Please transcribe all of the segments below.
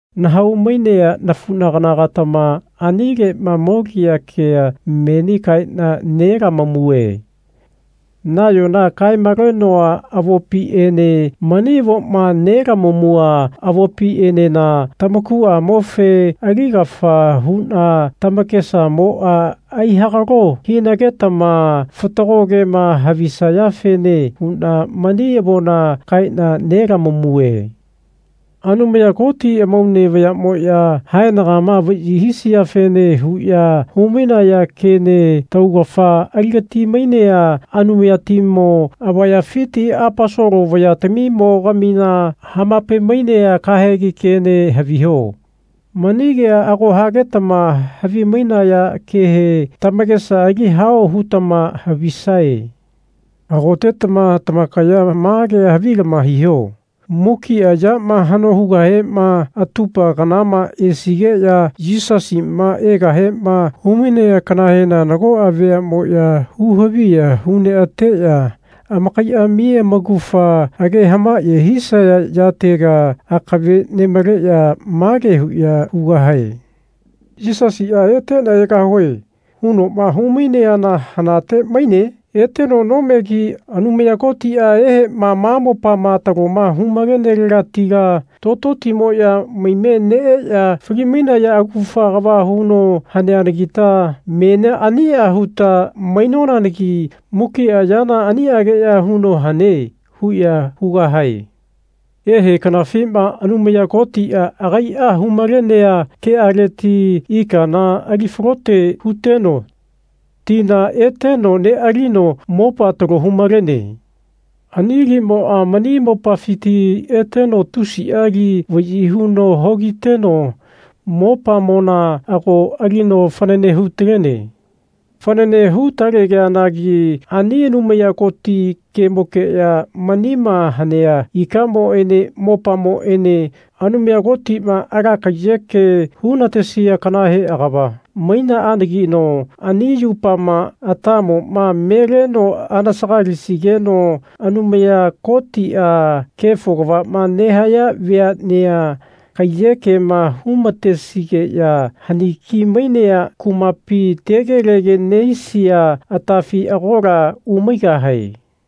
Nahau-mainea nafunagana-gatama anilema molia kea menia kaena nelamamue. Nayona kae-malenoa avopiene mani avoma nelamamua avopienena tamakuamofe aligafa huna tamakesamoa aihagalo hinagetama fatago kema havisayafene huna mani avona kaena nelamamue. Anumaya Koti amaune vayamoya haenagama vayi hisiafene huya humainaya kene taugafa aligati-mainea Anumayatimo avayafiti Aposolo vayatamimo-gamina hamapai-mainea kahegi kene haviho. Mani kea ago hagetama havi-mainaya kehe tamakesa ali hao hutama havisae. Hagotetama tamakaya ma kea havilama hiho. Mukia yama hano hugahema atupa kanama esigeya Yisasima egahema humainea kanahena nagoa veamoya hu-haviya hu neateya amakaiami amaugafa age hamaye hisaya yatega akave nemaleya mage huya hugahae. Yisasia Etena egahue. hunoma hu-maineana hanate maine? Eteno nomegi. Anumaya Kotia ehema ma mopama taloma hu-malenelegatila tototimoya maime neeya fali-mainaya augafa kava huno haneanagita menia ania huta mainonagi mukia yana aniageya huno hane. huya hugahae. Ehe kanafima Anumaya Kotia agaia hu-malenea kealeti ikana ali falote huteno tina eteno nealino mopa talo hu-malene. Ani limoa mani mopafiti eteno tusia li vayi huno hogiteno mopamona ago alino fanane hu-talene. Fanane hu-taleanagi ani Anumaya Koti kemokeya menima hanea ikamoene mopamoene Anumaya Kotima ala kaiyeke hunatesia kanahe agava mainaanagino ani yupama atamoma me leno anasagalisigeno Anumaya Kotia kefo kavama nehaya veanea kaiyekema hu-matesigeya haniki-mainea kumapi tegelege nehisia atafi agola umaigahae.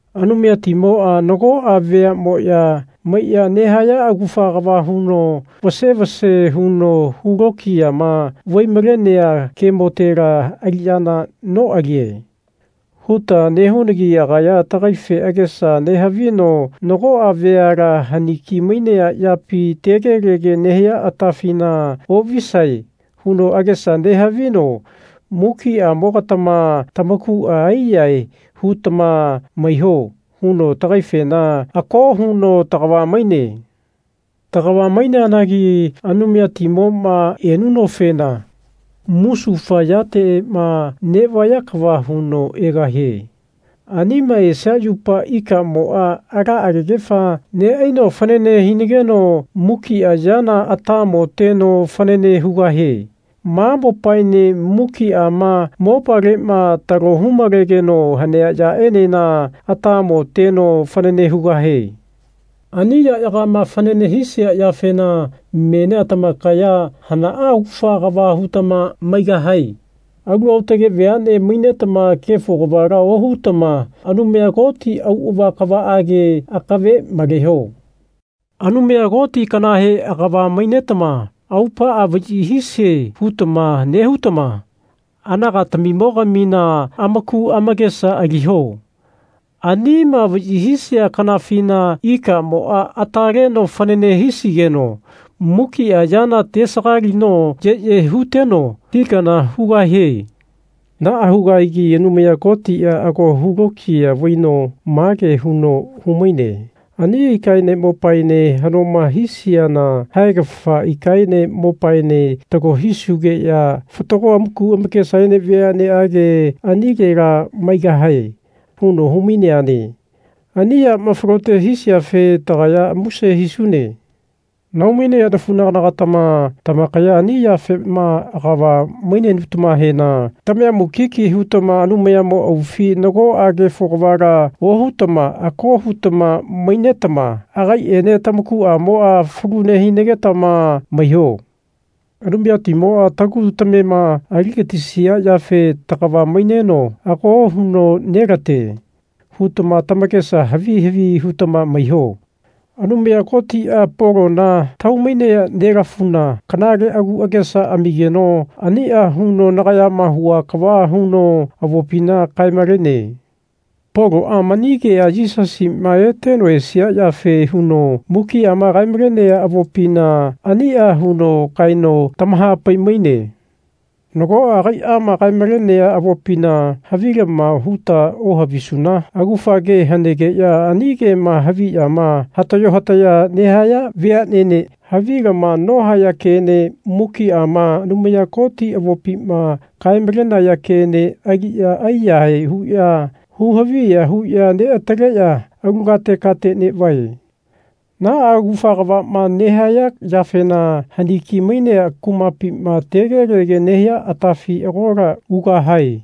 Anumayatimoa nagoa veamoya maiya nehaya augafa kava huno vase vase huno hu lokiyama vai-malenea kemotela aliyana noalie. huta nehunagi agaya tagaife agesa nehavino Nagoa veala haniki-mainea yapi tegelege nehia atafina ovisae. huno agesa nehavino Mukiamo-gatama tamakua aiyahae hutama maiho. huno tagaifena ako huno tagava maine. Tagava maineanagi Anumayatimoma enunofena musufa yatema nevaya kava huno egahie. Anima esia yupa ikamoa ala agegefa neaino fanane hinageno mukia yana atamo teno fanane hugahie. Ma mopaene mukiama mopalema talo hu-malegeno hanea yaenena atamo teno fanane hugahie. Ani yayagama fanane hisia yafena menia tamakaya hana augafa kava hutama maigahae? Alu aotage veane mainetama kefo kavala ohutama Anumaya Koti auava kavaage akave maleho. Anumaya Koti kanahe agava mainetama Aupaa vayi hisie. hutama nehutama anagatamimogamina amaku amakesa aliho. Anima vayi hisia kanafina ikamoa ata leno fanane hisigeno mukia yana tesagalino yeye huteno ti kana hugahie. Naa hugahagi Anumaya Kotia ago hu lokiya vaino mage huno humaine Ani ikaene mopaene hanoma hisiana haegafa ikaene mopaene talo hisugeya fatago amaku amakesaene veaneage anilela maigahae. huno humaine. Ani yama falote hisiafe tagaya muse hisune. Nahau-mainea nafunagana-gatama tamakaya ani yafema agava mainenutamahena tamaya mukiki hutama Anumayamo aufi nagoa kefo kavala ohutama ako hutama mainetama agaiene tamakuamoa falu nehinagetama maiho. Anumayatimoa tagu tamema aligatisia yafe tagava maineno ako huno nelate. hutama tamakesa havi havi hutama maiho. Anumaya Kotia Polona tahau-mainea nelafuna kanale agu agesa amigeno ania huno nagayama hua kava huno avopina kae-malene. Poloa mani kea Yisasima eteno esia yafe huno mukiama kae-malenea avopina ania huno kaeno tamahapai-maine. Nagoa agaiama kae-malenea avopina havilama huta ohavisuna augafa ke hanegeya ani kema haviyama hatayo hataya nehaya veanene havilama nohaya kene mukiama Anumaya Koti avopima kae-malenaya kene aliya aiyahae huya hu haviya huya neataleya alu kate kate nevae. Naa augafa kavama nehaya yafena haniki-mainea kumapima tegelege nehia atafi agola ugahae.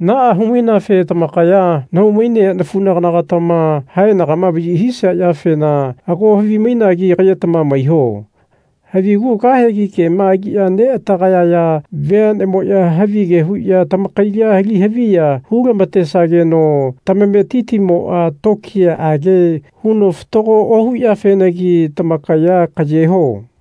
Naa hu-maineafe tamakaya nahau-mainea nafunagana-gatama haenagama vayi hisia yafena ago havimainagi kayetama maiho. Havigu kahegi kema aliya neatagayaya veanemoya havige huya tamakaila ali haviya hu-lamatesageno tamametitimoa tokiyaage huno fatago ohuyafenagi tamakaya kayeho.